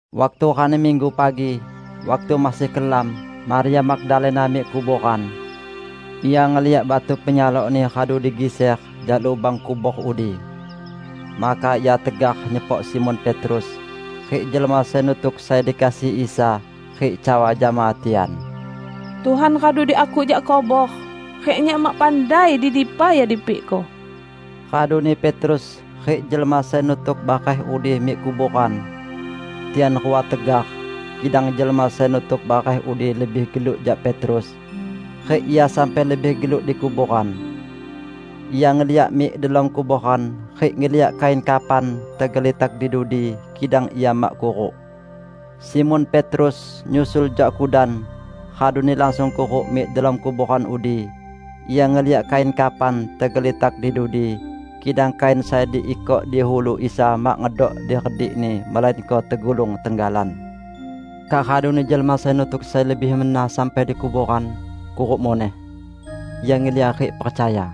Waktu rani Minggu pagi, waktu masih kelam, Maria Magdalena mik kuboran. Ia ngeliak batu penyalokni radu digiser jak lubang kubor udi. Maka ia tegar nyepok Simon Petrus rik jelma sai nutuk sai dikasihi Isa, rik cawa jama tian, "Tuhan radu diakuk jak kubor, rik nyak mak pandai di dipa Ia dipikko." Raduni Petrus rik jelma sai nutuk bareh udi mik kuboran. Tian rua tegar, kidang jelma sai nutuk bareh udi lebih geluk jak Petrus, rik ia sampai lebih geluk di kuboran. Ia ngeliak mik delom kuboran rik ngeliak kain kafan tegelitak di dudi, kidang ia mak kuruk. Simon Petrus nyusul jak kudan, raduni langsung kuruk mik delom kuboran udi. Ia ngeliak kain kafan tegelitak di dudi, kidang kain sai diikok di ulu Isa mak ngedok diredikni melainko tegulung tenggalan. Kak raduni jelma sai nutuk sai lebih mena sampai di kuboran, kuruk muneh. Ia ngeliak rik percaya. (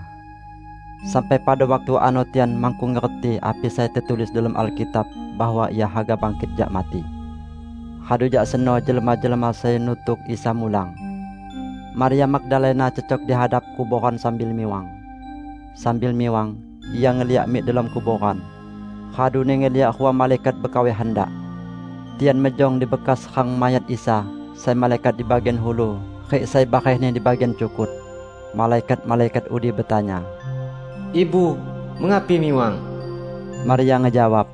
Sampai pada waktu ano tian makkung ngerti api sai tetulis delom Alkitab bahwa Ia haga bangkit jak mati.) Radu jak seno jelma-jelma sai nutuk Isa mulang. Maria Magdalena cecok di hadap kuboran sambil miwang. Sambil miwang, ia ngeliak mik delom kuboran, raduni ngeliak rua malaikat bekawai handak. Tian mejong dibekas rang mayat Isa, sai malaikat di bagian ulu, rik sai barehni di bagian cukut. Malaikat-malaikat udi betanya, "Ibu, mengapi miwang?" Maria ngejawab,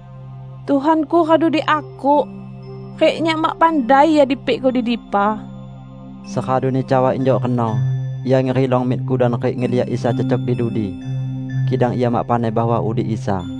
"Tuhanku radu diakuk, rik nyak mak pandai Ia dipikko di dipa." Seraduni cawa injuk reno, ia ngerilong mik kudan rik ngeliak Isa cecok di dudi. Kidang ia mak pandai bahwa udi Isa.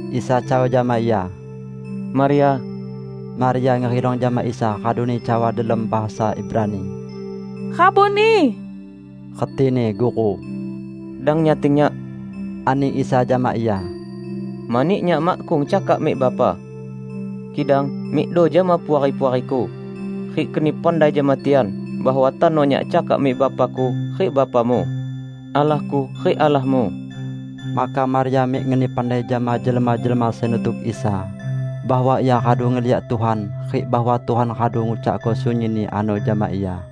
Isa cawa jama ia, "Maria!" Maria ngerilong jama Isa raduni cawa delom bahasa Ibrani, "Rabuni!" (Retini "Guru".) "Dang nyating Nyak," ani Isa jama ia, "mani Nyak makkung cakak mik Bapa. Kidang mikdo jama puari-puari-Ku, rik keni pandai jama tian bahwa tano Nyak cakak mik Bapa-Ku rik Bapamu, Allah-Ku rik Allahmu." Maka Maria mik ngeni pandai jama jelma-jelma sai nutuk Isa bahwa ia radu ngeliak Tuhan rik bahwa Tuhan radu ngucakko sunyinni ano jama ia.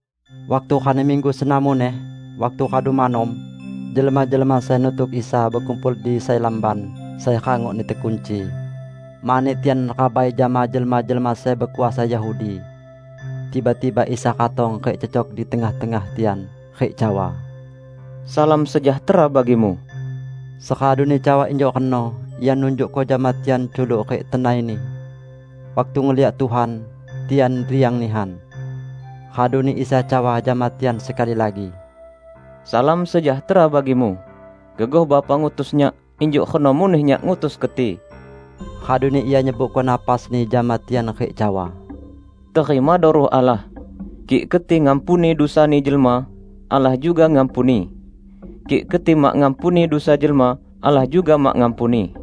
Waktu rani Minggu seno muneh, waktu radu manom, jelma-jelma sai nutuk Isa bekumpul di sai lamban sai rangokni tekunci, mani tian rabai jama jelma-jelma sai bekuasa Yahudi. Tiba-tiba Isa ratong rik cecok di tengah-tengah tian rik cawa, "Salam sejahtera bagimu." Seraduni cawa injuk reno, Ia nunjukko jama tian culuk rik tenai-Ni. Waktu ngeliak Tuhan, tian riang nihan. Raduni Isa cawa jama tian sekali lagi, "Salam sejahtera bagimu. Gegoh Bapa ngutus Nyak, injuk reno muneh Nyak ngutus keti." Raduni Ia nyebuko napas-Ni jama tian rik cawa, "Terimado Ruh Allah. Kik keti ngampuni dusani jelma, Allah juga ngampuni. Kik keti mak ngampuni dusa jelma, Allah juga mak ngampuni."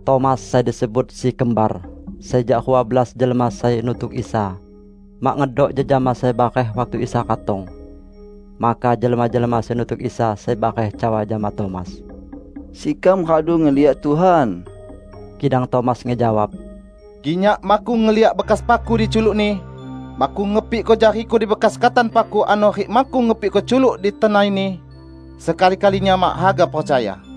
Tomas (sai disebut si "Kembar"), sai jak rua belas jelma sai nutuk Isa, mak ngedok jejama sai bareh waktu Isa ratong. Maka jelma-jelma sai nutuk Isa sai bareh cawa jama Tomas, "Sekam radu ngeliak Tuhan!" Kidang Tomas ngejawab, "Kik nyak makkung ngeliak bekas paku di culuk-Ni, makkung ngepikko jariku di bekas katan paku ano rik makkung ngepikko culuk di tenai-Ni, sekali-kali nyak mak haga percaya."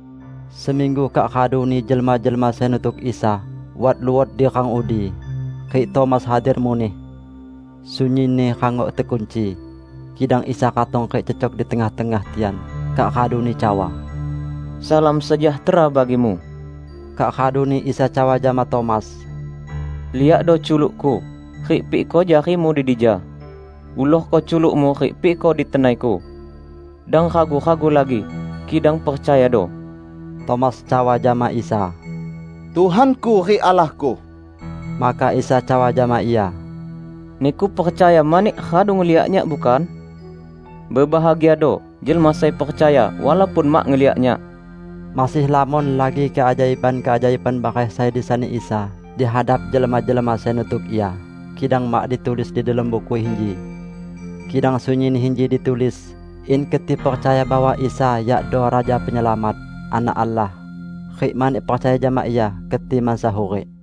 Seminggu kak raduni jelma-jelma sai nutuk Isa wat luot di rang udi, rik Tomas hadir muneh. Sunyinni rangok tekunci. Kidang Isa ratong rik cecok di tengah-tengah tian, kak raduni cawa, "Salam sejahtera bagimu." Kak raduni Isa cawa jama Tomas, "Liakdo culuk-Ku, rik pikko jarimu di dija. Ulorko culukmu rik pikko di tenai-Ku. Dang ragu-ragu lagi, kidang percayado!" Tomas cawa jama Isa, "Tuhanku rik Allahku!" Maka Isa cawa jama ia, "Niku percaya mani radu ngeliak Nyak, bukan? Bebahagiado jelma sai percaya walaupun mak ngeliak Nyak!" Masih lamon lagi keajaiban-keajaiban bareh sai disani Isa di hadap jelma-jelma sai nutuk Ia, kidang mak ditulis di delom buku inji. Kidang sunyinni inji ditulis, in keti percaya bahwa Isa yakdo Raja Penyelamat, Anak Allah, rik mani percaya jama Ia, keti mansa hurik.